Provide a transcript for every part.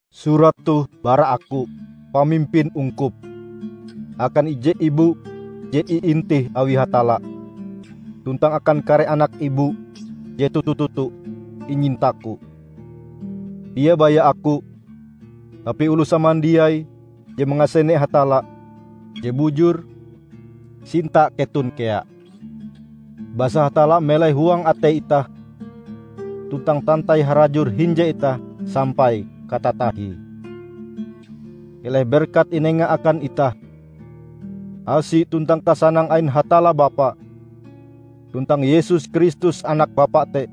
Surat toh bara aku, pamimpin ungkup, akan ije Ibu je iintih awi Hatalla, tuntang akan kare anak Ibu je toto-toto inyintaku. Dia baya aku, tapi oloh samandiai je mangasene Hatalla je bujur, sinta keton kea. Basa Hatalla melai huang atei itah, tuntang tantai harajur hinje itah sampai katatahie. Keleh berkat inenga akan itah, asi tuntang kasanang ain Hatalla Bapa, tuntang Yesus Kristus Anak Bapa te.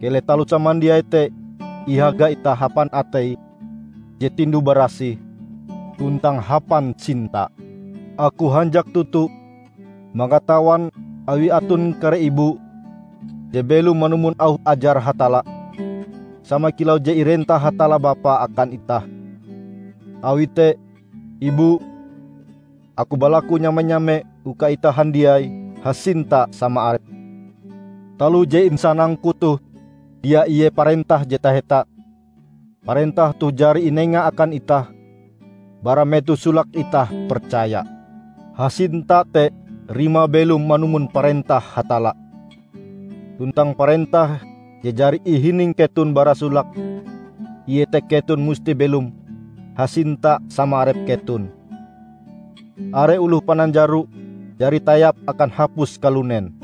Keleh taloh samandiai te ihaga itah hapan atei je tinduh-barasih tuntang hapan sinta. Aku hanjak toto mangatawan awi aton kare Ibu je belom manumon auh ajar Hatalla, sama kilau je irentah Hatalla Bapa akan itah. Awi te, Ibu, aku balaku nyame-nyame uka itah handiai hasinta sama arep. Taloh je insanangku toh dia ie parentah je taheta; parentah toh jari inenga akan itah bara metoh solake itah percaya. Hasinta te rimae belom manumon parentah Hatalla. Tuntang parentah je jari ihining keton bara solake iete keton musti belom hasinta sama arep keton. Are oloh pananjaro jari tayap akan hapus kalunen.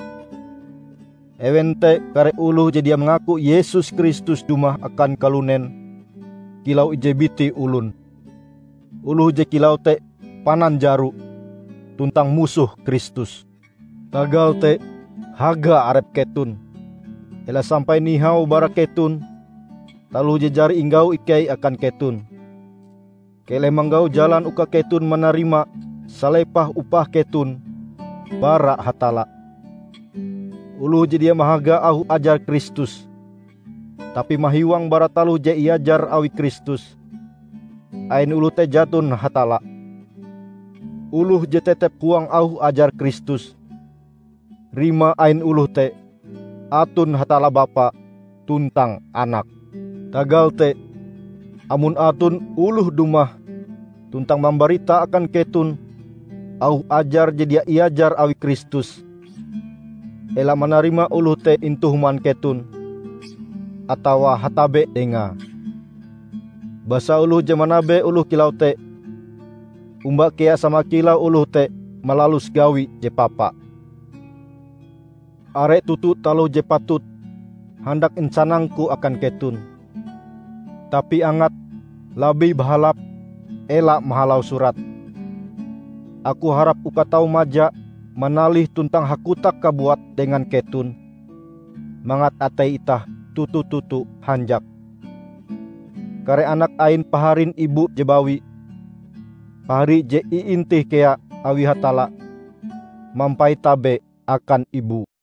Ewen te kare oloh je dia mangaku Yesus Kristus dumah akan kalunen kilau ije biti olon. Oloh je kilau te pananjaro, tuntang musoh Kristus. Tagal te, haga arep keton, ela sampai nihau bara keton taloh je jari inggau ikei akan keton. Keleh manggau jalan uka keton manarima salepah upah keton bara Hatalla. Oloh je dia mahaga auh ajar Kristus, tapi mahiwang bara taloh je iajar awi Kristus, ain oloh te jaton Hatalla. Oloh je tetep huang auh ajar Kristus, rimae ain oloh te aton Hatalla Bapa tuntang Anak. Tagal te, amon aton oloh dumah tuntang mambarita akan keton auh ajar je dia iajar awi Kristus, ela manarima oloh te intu human keton, atawa hatabe dengae. Basa oloh je manabe oloh kilau te, omba kea sama kilau oloh te malalus gawi je papa. Are toto taloh je patut handak insanangku akan keton, tapi angate labih bahalap ela mahalau surat. Aku harap uka tau maja manalih tuntang hakotak kabuat dengan keton, mangat atei itah toto-toto hanjak. Kare anak ain paharin Ibu je bawi, pahari je iintih kea awi Hatalla, mampait tabe akan Ibu.